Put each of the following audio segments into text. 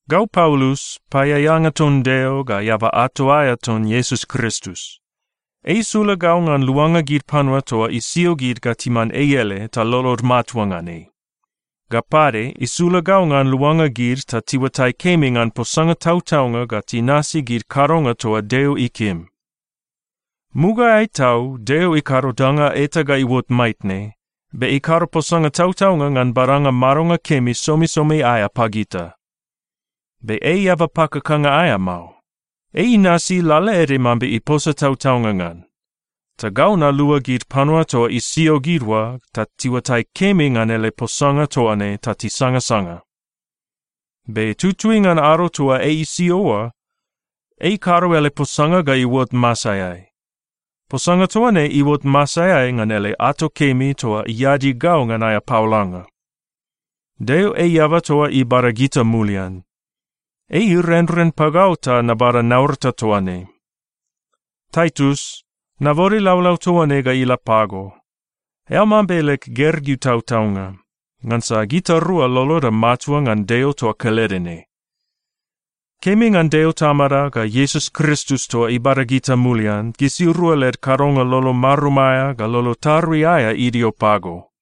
Gau Paulus, paeaeanga ton Deo ga eaba ato aea ton Iesus Kristus. Ei isula gau ngan luanga gid panua toa isio gid ga timan ei ele ta lolod matua ngan ei. Ga pade, isula gau ngan luanga gid ta tiuatai kemi ngan posanga tautaunga ga tinasi gid kadonga toa Deo ikim. Mugaeai tau Deo ikado danga eta ga iuot maitne, be ikado posanga tautaunga ngan badanga madonga kemi somisomi aea pagita. Be ei eaba pakakanga aea mao. Ei inasi lalaede mambe iposa tautaunga ngan. Ta gau nalua gid panua toa isio gid oa ta tiuatai kemi ngan ele posanga toa ne ta tisangasanga. Be tutui ngan ado toa ei isio oa, ei ikado ele posanga ga iuot masaeai. Posanga toa ne iuot masaeai ngan ele ato kemi toa iadi gau ngan aea paolanga. Deo ei eaba toa ibada gita mulian. Ei irenren pagau ta nabada naurata toa ne. Taitus, nabode laulau toa ne ga ila pago. Eao mambe leg gergeu tautaunga, ngansa gitarua loloda matua ngan Deo toa kelede ne. Kemi ngan Deo Tamada ga Iesus Kristus toa ibada gita mulian, gisirua led kadonga lolo marum aea ga lolo tarui aea idio pago.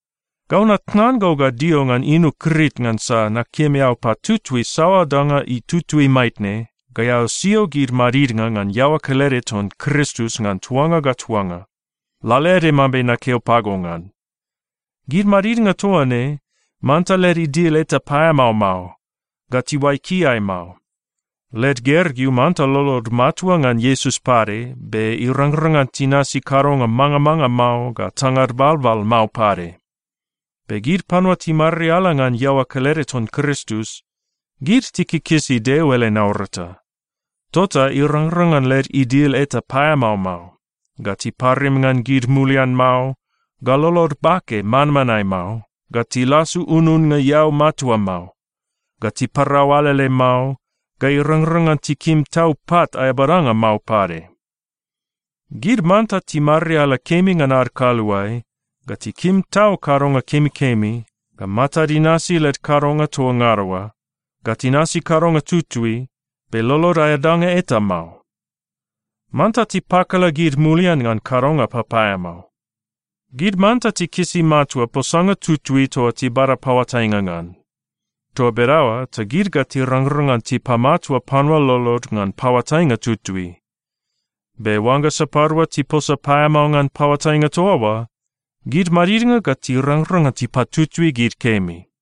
Gau natnan go ga dio ngan inu Krit ngansa nakim eao patutui saoa danga itutui maitne ga eao sio gid madidnga ngan iaoa kelede ton Kristus ngan tuanga ga tuanga, lalaede mambe nakeo pago ngan. Gid madidnga toa ne, manta led idil eta paeamao mao, ga tiuai kiai mao. Led gergeu manta lolod matua ngan Iesus pade be irangrang ngan tinasi kadonga mangamanga mao ga tangad balbal mao pade. Be gid panua timariala ngan iaoa kelede ton Kristus, gid tikikisi Deo ele naurata. Tota irangrang ngan led idil eta paeamao mao, ga tiparim ngan gid mulian mao, ga lolod bake manmanae mao, ga tilasu ununnga eau matua mao, ga tiparau alele mao, ga irangrang ngan tikim tau pat aea badanga mao pade. Gid manta timariala kemi ngan ad kaluae, ga tikim tau kadonga kemikemi, ga matad inasi led kadonga toa ngada oa, ga tinasi kadonga tutui, be lolod aea danga eta mao. Manta tipakala gid mulian ngan kadonga papaeamao. Gid manta tikisi matua posanga tutui toa tibada paoatainga ngan. Toa bedaoa ta gid ga tirangrang ngan tipamatua panua lolod ngan paoatainga tutui. Be oangga sapadua tiposa paeamao ngan paoatainga toa oa, gid madidnga ga tirangrang ngan tipatutui gid kemi.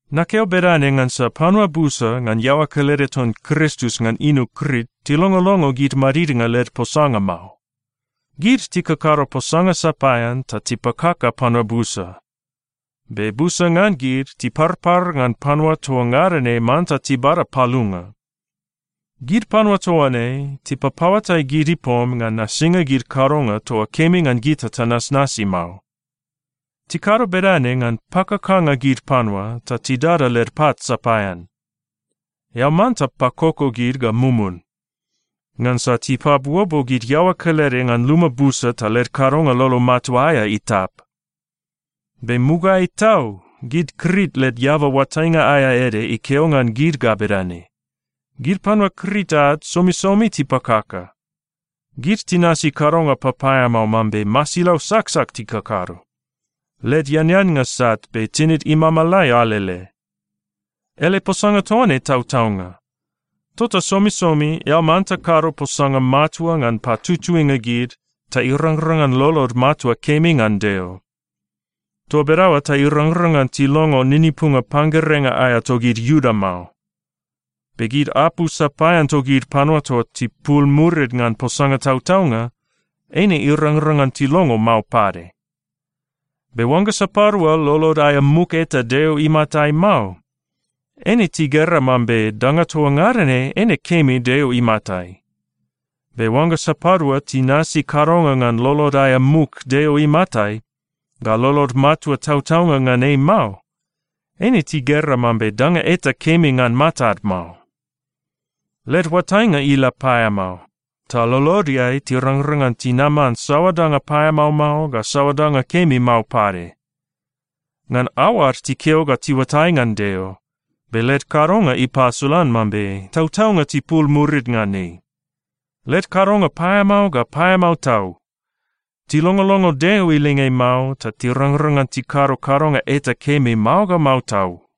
Nakeo bedane ngansa panua busa ngan iaoa kelede ton Kristus ngan inu Krit tilongolongo gid madidnga led posanga mao. Gid tikakado posanga sapaean ta tipakaka panua busa. Be busa ngan gid tiparpar ngan panua toa ngada ne manta tibada palunga. Gid panua toa ne tipapaoatai gid ipom ngan nasinga gid kadonga toa kemi ngan gita tanasnasi mao. Tikado bedane ngan pakakanga gid panua ta tidada led pat sapaean. Eao manta pakoko gid ga mumun, ngansa tipabuobuo gid iaoa kelede ngan luma busa, ta led kadonga lolo matua aea itap. Be mugaeai tau gid Krit led eaba oatainga aea ede ikeo ngan gid ga bedane, “Gid panua Krit ad somisomi tipakaka. Gid tinasi kadonga papaeamao mambe masilau saksak tikakado. Led eaneannga sat, be tinid imamalai alele.” Ele posanga toa ne tautaunga. Tota somisomi eao manta kado posanga matua ngan patutuinga gid ta irangrang ngan lolod matua kemi ngan Deo. Toa bedaoa ta irangrang ngan tilongo ninipunga panggerenga aea togid Iuda mao. Be gid apu sapaean togid panua toa tipul murid ngan posanga tautaunga, eine irangrang ngan tilongo mao pade. Be oangga sapadua lolod aea muk eta Deo imatai mao, eine tigera mambe danga toa ngada ne eine kemi Deo imatai. Be oangga sapadua tinasi kadonga ngan lolod aea muk Deo imatai, ga lolod matua tautaunga ngan ei mao, eine tigera mambe danga eta kemi ngan matad mao. Led oatainga ila paeamao, ta lolodeai tirangrang ngan tinaman saoa danga paeamao mao, ga saoa danga kemi mao pade. Ngan aoad tikeo ga tiuatai ngan Deo, be led kadonga ipasolan mambe tautaunga tipul murid ngan ei. Led kadonga paeamao ga paeamao tau. Tilongolongo Deo ilinge mao ta tirangrang ngan tikado kadonga eta kemi mao ga mao tau.